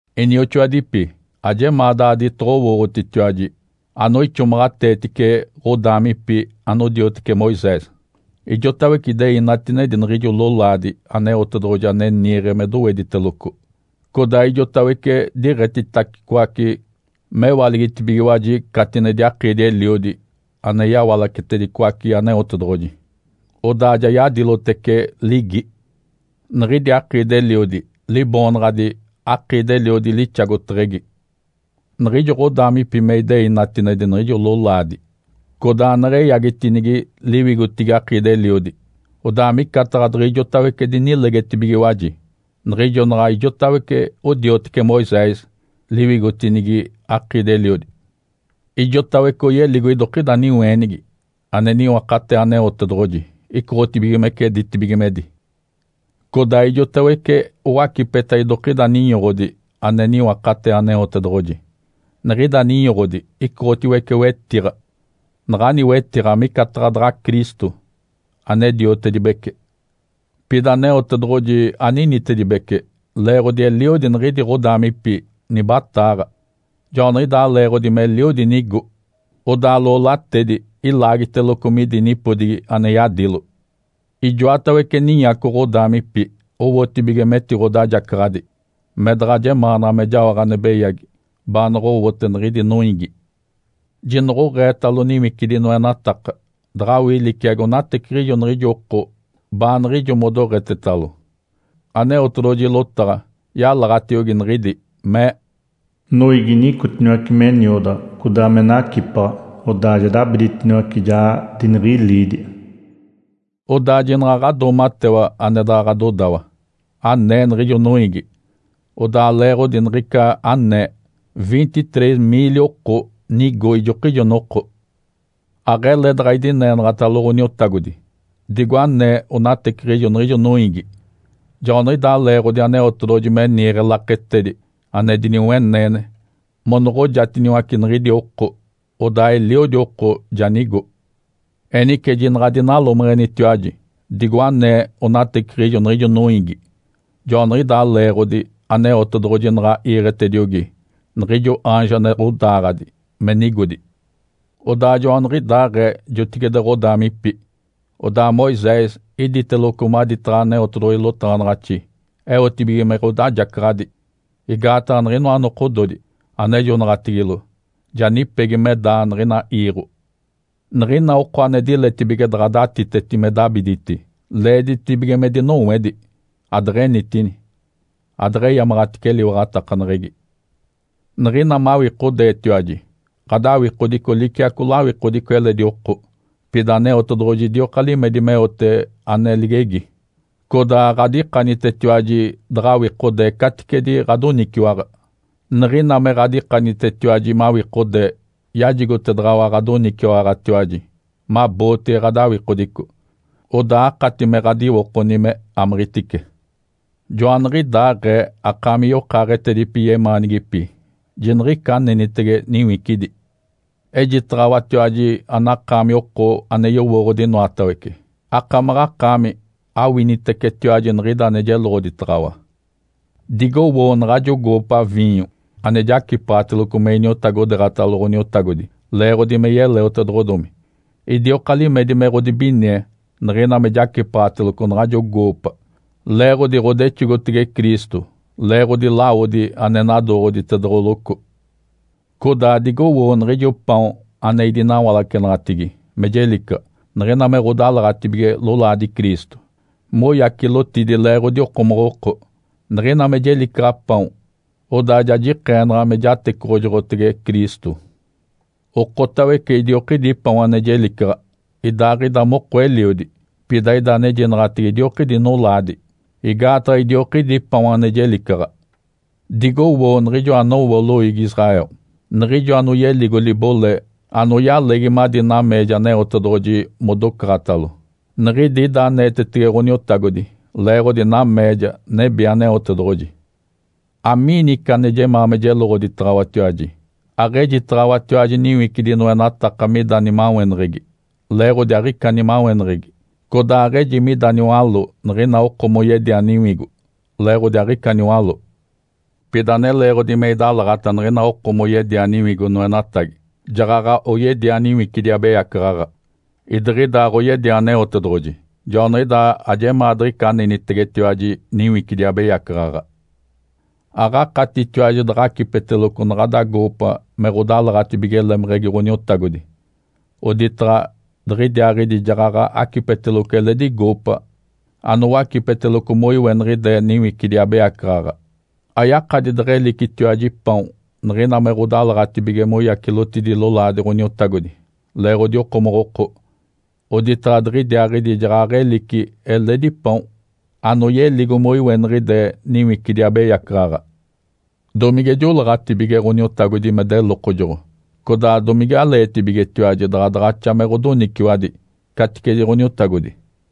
Inioxoadipi, ajemaa daaditoɡ̶owooɡ̶otitiwaji anoixomaɡ̶ateetice ɡ̶odaamipi anodioteci Moisés. Ijotawece idei natinedi niɡ̶ijo lolaadi Aneotedoɡ̶oji ane niiɡ̶e me dowediteloco, codaa ijotawece diɡ̶etitacicoace, mewaligitibigiwaji catinedi akiidi-eliodi ane yawalacetedicoace Aneotedoɡ̶oji, odaa ja yadilotece ligi. Niɡ̶idi akiidi-eliodi liboonaɡ̶adi “Akiidi-eliodi lixagoteɡ̶egi.” Niɡ̶ijo ɡ̶odaamipi me idei natinedi niɡ̶ijo lolaadi codaa neɡ̶eyagitinigi liwigotigi akiidi-eliodi. Odaa micataɡ̶a diɡ̶ijotawece dinilegetibigiwaji, niɡ̶ijo naɡ̶a ijotawece odioteci Moisés liwigotinigi akiidi-eliodi. Ijotawece oyeligo idokida niweenigi ane niwakatee Aneotedoɡ̶oji icoɡ̶otibigimece ditibigimedi. Codaa ijotawece owacipeta idokida ninyoɡ̶odi ane niwakatee Aneotedoɡ̶oji. Niɡ̶ida ninyoɡ̶odi icoɡ̶otiwece wetiɡ̶a. Naɡ̶ani wetiɡ̶a micataɡ̶a daɡ̶a Cristo, ane diotedibece. Pida Aneotedoɡ̶oji aninitedibece leeɡ̶odi eliodi niɡ̶idi ɡ̶odaamipi nibataaɡ̶a, joaniɡ̶idaa leeɡ̶odi meliodi nigo, odaa loolatedi ilaagiteloco midi nipodigi ane yadilo. Ijoatawece ninyaco ɡ̶odaamipi owotibige metiɡ̶odajacaɡ̶adi, me daɡ̶a jemaanaɡ̶a me jaoɡ̶a ane beyagi baanoɡ̶owote niɡ̶idi noiigi. Jinoɡ̶oɡ̶eetalo niwicidi noenataka daɡ̶awii liciagi onateciɡ̶ijo niɡ̶ijo oko baaniɡ̶ijo modoɡ̶etetalo. Aneotedoɡ̶oji lotaɡ̶a yalaɡ̶atiogi niɡ̶idi, mee, “Noiigi nicotiniwace me niodaɡ̶a codaa me nacipaɡ̶a, odaa ja dabiditiniwace, ja diniɡ̶iliidi.” Odaa jinaɡ̶a ɡ̶adoomatewa ane daɡ̶a ɡ̶adodawa, anee niɡ̶ijo noiigi. Odaa leeɡ̶odi niɡ̶ica anee, vinte-três miili oko nigo ijokijo noko. Aɡ̶ele daɡ̶a idineenaɡ̶atalo Ǥoniotagodi, digo anee onateciɡ̶ijo niɡ̶ijo noiigi. Joaniɡ̶idaa leeɡ̶odi Aneotedoɡ̶oji me niiɡ̶e laketedi ane diniweneene monoɡ̶ojatiniwace niɡ̶idi oko, odaa eliodi oko ja nigo. Enice jinaɡ̶a adinalomeɡ̶enitiwaji, digo anee onateciɡ̶ijo niɡ̶ijo noiigi. Joaniɡ̶idaa leeɡ̶odi Aneotedoɡ̶oji naɡ̶a iiɡ̶etediogi niɡ̶ijo aanjo ane ɡ̶odaaɡ̶adi me nigodi. Odaa joaniɡ̶idaaɡ̶ee jotigide ɡ̶odaamipi, odaa Moisés iditeloco maditaɡ̶a Aneotedoɡ̶oji lotaɡ̶anaɡ̶axi eotibige me ɡ̶odajacaɡ̶adi. Igaataɡ̶a niɡ̶inoa nokododi anejonaɡ̶atigilo ja nipegi me daa niɡ̶ina iiɡ̶o. Niɡ̶ina oko ane diletibige daɡ̶a datiteti me dabiditi, leeditibige me dinowedi adeɡ̶enitini, adeɡ̶eyamaɡ̶atice eliwaɡ̶atakaneɡ̶egi. Niɡ̶ina mawikodeetiwaji, ɡ̶adawikodico liciaco lawikodico eledi oko. Pida Aneotedoɡ̶oji idioka limedi meote ane ligegi, codaa aɡ̶adikanitetiwaji daɡ̶awikodee caticedi ɡ̶adoniciwaɡ̶a. Niɡ̶ina me ɡ̶adikanitetiwaji mawikodee yajigotedaɡ̶awa ɡ̶adoniciwaɡ̶atiwaji mabootege ɡ̶adawikodico, odaa akati me ɡ̶adiwokoni me amiɡ̶itice. Joaniɡ̶idaaɡ̶ee, akaami yokaaɡ̶etedipi yemaanigipi, jiniɡ̶ica anenitege niwicidi. Ejitaɡ̶awatiwaji anakaami oko ane yowooɡ̶odi inoatawece. Akamaɡ̶akaami awinitecetiwaji niɡ̶ida ane jeloɡ̶oditaɡ̶awa. Digowoo naɡ̶ajo goopa viinyo ane jacipaɡ̶ateloco me iniotagodeeɡ̶atalo Ǥoniotagodi leeɡ̶odi me yeleotedoɡ̶odomi. Idioka limedi me ɡ̶odibinie niɡ̶ina me jacipaɡ̶ateloco naɡ̶ajo goopa, leeɡ̶odi ɡ̶odexogotege Cristo leeɡ̶odi lawodi ane nadooɡ̶oditedoɡ̶oloco. Codaa digowoo niɡ̶ijo paon ane idinawalacenaɡ̶atigi me jelicaɡ̶a niɡ̶ina me ɡ̶odalaɡ̶atibige lolaadi Cristo moyacilotidi leeɡ̶odi okomoɡ̶oko. Niɡ̶ina me jelicaɡ̶a paon, odaa ja jikeenaɡ̶a me jatecoɡ̶ojoɡ̶otege Cristo. Okotawece idiokidi paon ane jelicaɡ̶a, idaaɡ̶ida moko eliodi, pida ida anejinaɡ̶atege idiokidi nolaadi, igaataɡ̶a idiokidi paon ane jelicaɡ̶a. Digowoo niɡ̶ijo anowo loiigi Israel. Niɡ̶ijo anoyeligo libole anoyalegi madi nameeja Aneotedoɡ̶oji modocaɡ̶atalo niɡ̶idi ida aneetetege Ǥoniotagodi leeɡ̶odi nameeja nebi Aneotedoɡ̶oji. Amiini ica ane jemaa me jeloɡ̶oditaɡ̶awatiwaji? Aɡ̶ejitaɡ̶awatiwaji niwicidi noenataka mida nimaweneɡ̶egi. (Leeɡ̶odi aɡ̶ica nimaweneɡ̶egi!) Codaa aɡ̶eji mida niwaló niɡ̶ina oko moyedia niwigo. (Leeɡ̶odi aɡ̶ica niwaló!) Pida ane leeɡ̶odi me idalaɡ̶ata niɡ̶ina oko moyedia niwigo noenatagi, jaɡ̶aɡ̶a oyedia niwicidi abeyacaɡ̶aɡ̶a, idiɡ̶ida aɡ̶oyedia Aneotedoɡ̶oji. Joaniɡ̶idaa ajemaa diɡ̶ica anenitegetiwaji niwicidi abeyacaɡ̶aɡ̶a. Aɡ̶akatitiwaji daɡ̶a acipeteloco naɡ̶ada goopa me ɡ̶odalaɡ̶atibige lemeɡ̶egi Ǥoniotagodi, oditaɡ̶a diɡ̶idiaaɡ̶idi jaɡ̶aɡ̶a acipeteloco eledi goopa anowacipeteloco moiweniɡ̶ide niwicidi abeyacaɡ̶aɡ̶a. Ayakadi deɡ̶elicitiwaji paon niɡ̶ina me ɡ̶odalaɡ̶atibige moyacilotidi lolaadi Ǥoniotagodi leeɡ̶odi okomoɡ̶oko, oditaɡ̶a diɡ̶idiaaɡ̶idi jaɡ̶aɡ̶elici eledi paon anoyeligo moiweniɡ̶ide niwicidi abeyacaɡ̶aɡ̶a. Domige joleeɡ̶atibige Ǥoniotagodi me delokojoɡ̶o? Codaa domigaleetibigetiwaji daɡ̶a daɡ̶axa me ɡ̶odoniciwadi caticedi Ǥoniotagodi?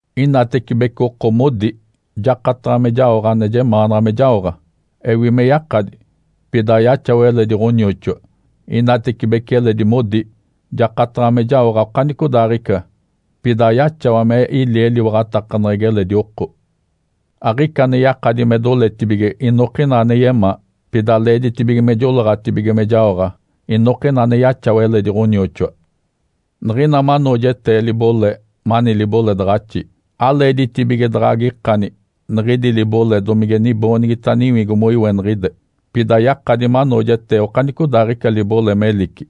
Inatecibece oko modi, “Jakataɡ̶a me jaoɡ̶a ane jemaanaɡ̶a me jaoɡ̶a!” Ewi me yakadi, pida ayaxawa eledi ɡ̶anioxoa. Inatecibece eledi modi, “Jakataɡ̶a me jaoɡ̶a okanicodaaɡ̶ica!” Pida ayaxawa me ili eliwaɡ̶atakaneɡ̶egi eledi oko. Aɡ̶ica ane yakadi me doletibige inokina ane yemaa, pida leeditibige me joleeɡ̶atibige me jaoɡ̶a inokina ane yaxawa eledi ɡ̶onioxoa. Niɡ̶ina manoojetee libole mani liboledaɡ̶axi, aleeditibige daɡ̶a agikani niɡ̶idi libole domige niboonigita niwigo moiweniɡ̶ide. Pida yakadi manoojetee okanicodaaɡ̶ica libole melici,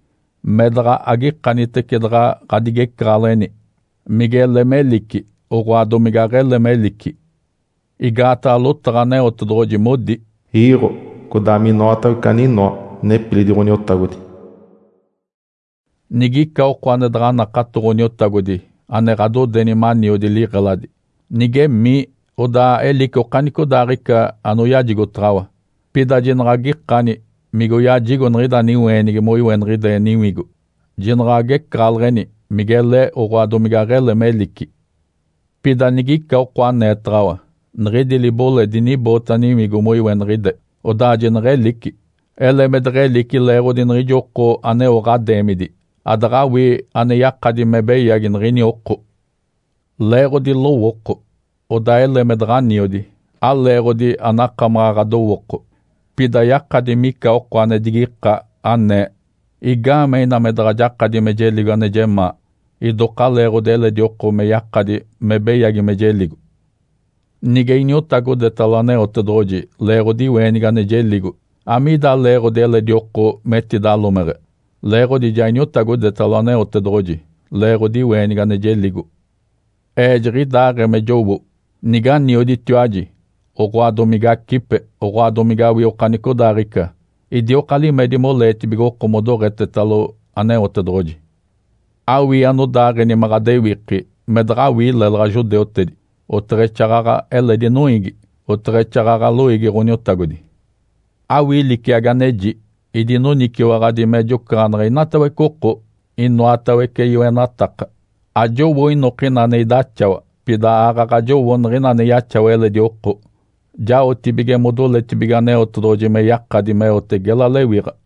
me daɡ̶a agikanitece daɡ̶a ɡ̶adigecaɡ̶aleɡ̶eni migele melici, oɡ̶oa domige aɡ̶ele melici. Igaataɡ̶a lotaɡ̶a Aneotedoɡ̶oji modi, “Iiɡ̶o, codaa minoatawece aninoa, nepilidi Ǥoniotagodi.” Nigica oko ane daɡ̶a nakato Ǥoniotagodi ane ɡ̶adodeni maniodi liɡ̶eladi, nigemii, odaa elici okanicodaaɡ̶ica anoyajigotaɡ̶awa, pida jinaɡ̶a agikani migoyajigo niɡ̶ida niweenigi moiweniɡ̶ide niwigo. Jinaɡ̶a agecaɡ̶aleɡ̶eni migele, oɡ̶oa domige aɡ̶ele melici. Pida nigica oko aneetaɡ̶awa, “Niɡ̶idi libole diniboota niwigo moiweniɡ̶ide”, odaa jineɡ̶elici. Ele me deɡ̶elici leeɡ̶odi niɡ̶ijo oko aneo ɡ̶adeemidi, adaɡ̶awii ane yakadi me beyagi niɡ̶ini oko. Leeɡ̶odi lowooko, odaa ele me daɡ̶aniodi, aleeɡ̶odi anakamaɡ̶a ɡ̶adowooko. Pida yakadi mica oko ane digika, anee, “Igaamee ina me daɡ̶a jakadi me jeligo ane jemaa idoka leeɡ̶odi eledi oko me yakadi me beyagi me jeligo? Nige iniotagodetalo Aneotedoɡ̶oji leeɡ̶odi iweenigi ane jeligo, amiida leeɡ̶odi eledi oko metidalomeɡ̶e? Leeɡ̶odi ja iniotagodetalo Aneotedoɡ̶oji leeɡ̶odi iweenigi ane jeligo.” Ee jiɡ̶idaaɡ̶ee me jowo. Niganioditiwaji, oɡ̶oa domigacipe, oɡ̶oa domigawii okanicodaaɡ̶ica, idioka limedi moleetibige oko modoɡ̶etetalo Aneotedoɡ̶oji. Awii anodaaɡ̶eni me ɡ̶adewiki me daɡ̶awii lélaɡ̶a judeutedi, oteɡ̶exaaɡ̶aɡ̶a eledi noiigi, oteɡ̶exaaɡ̶aɡ̶a loiigi Ǥoniotagodi. Awii liciagi aneji. Idinoniciwaɡ̶adi me jocaɡ̶aneɡ̶e inatawece oko inoatawece yoenataka. Ajowo inokina ane idaxawa, pida aaɡ̶aɡ̶a jowo niɡ̶ina ane yaxawa eledi oko, jaotibige modoletibige Aneotedoɡ̶oji me yakadi meote gela lewiɡ̶a.